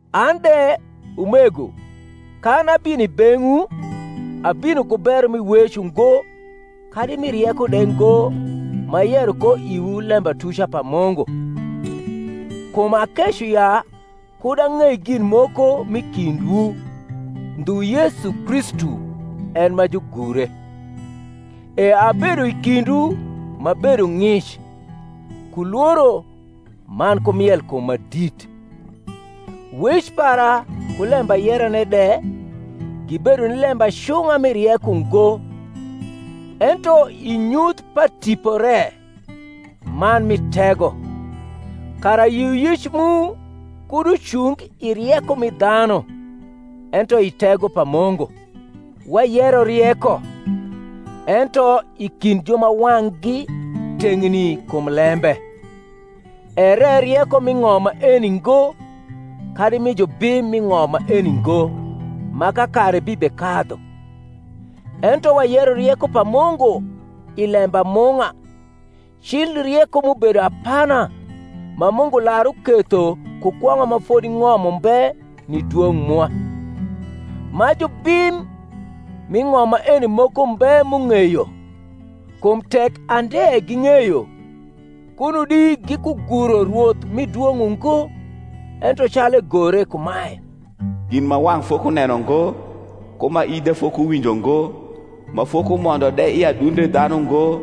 An de, umego, kan abino i beng’wu, abino ku bero mi wec ungo kadi mi rieko de ngo m’ayero ko iwu lembatuca pa Mungu. Kum akeco ya kud ang’ei gin moko m’i kindwu, ndhu Yesu Kristu, en ma jugure. E abedo i kindwu m’abedo ng’ic, ku lworo, man ku mielkum ma dit. Wec para ku lembayerane de gibedo ni lembacung’a mi rieko ngo, ento i nyuth pa Tipo re man mi tego: kara yioyic mu kud ucung i rieko mi dhanu, ento i tego pa Mungu. Wayero rieko, ento, i kind ju ma wang’gi teng’ni kum lembe: ere rieko m’i ng’om maeni ngo, kadi mi jubim m’i ng’om maeni ngo, ma kakare bibekadhu: ento wayero rieko pa Mungu i lembamung’a, cil rieko m’ubedo apana, ma Mungu lar uketho ku kwong’a ma fodi ng’om umbe ni dwong’ mwa: ma jubim m’i ng’om maeni moko mbe m’ung’eyo: kum tek ande ging’eyo, kuno di gikuguro Rwoth mi dwong’ ungo; ento calu egore kumae, Gin ma wang’ fokuneno ngo, ku ma ith de fokuwinjo ngo, Ma fokumondo de i adunde dhanu ngo,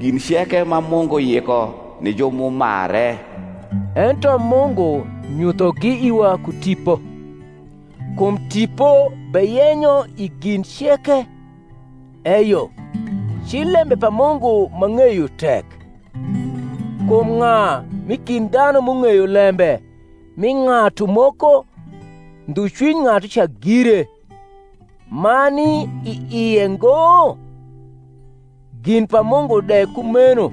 Gin ceke ma Mungu yiko ni ju m’umare. Ento Mungu nyuthogi iwa ku Tipo: kum Tipo beyenyo i gin ceke, eyo, cil lembe pa Mungu ma ng’eyo tek. Kum ng’a m’i kind dhanu m’ung’eyo lembe m’i ng’atu moko, ndhu cwiny ng’atuca gire, ma ni i ie ngo? gin pa Mungu de kumeno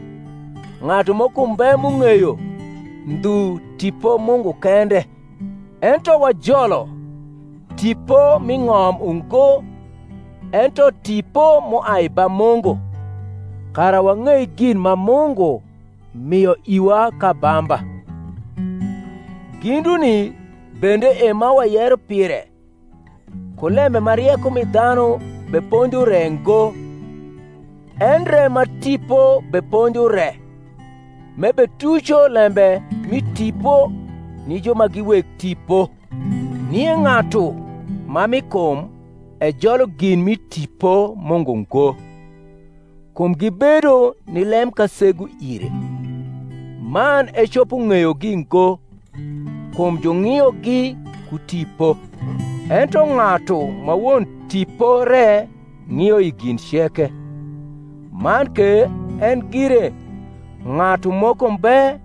ng’atu moko mbe m’ung’eyo, ndhu Tipo Mungu kende. Ento wajolo, tipo m’i ng’om ungo, ento tipo m’uai ba Mungu; kara wang’ei gin ma Mungu mio iwa k’abamba. Ginduni bende e ma wayero pire, ku lembe ma rieko mi dhanu beponjo re ngo, endre ma Tipo beponjo re; m’ebetuco lembe mi tipo ni ju ma gi weg tipo. Nie ng’atu ma mi kum ejolo gin mi Tipo Mungu ngo: kum gibedo ni lemkasegu ire; man ecopo ng’eyogi ngo, kum jung’iogi ku tipo. Ento ng’atu ma won tipo re ng’io i gin ceke, man ke en gire ng’atu moko mbe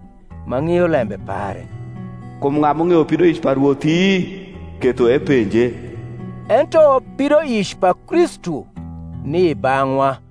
ma ng’io lembe pare. Kum ng’a m’ung’eyo pidoic pa Rwothi, ketho eponje? Ento pidoic pa Kristu ni i bang’wa.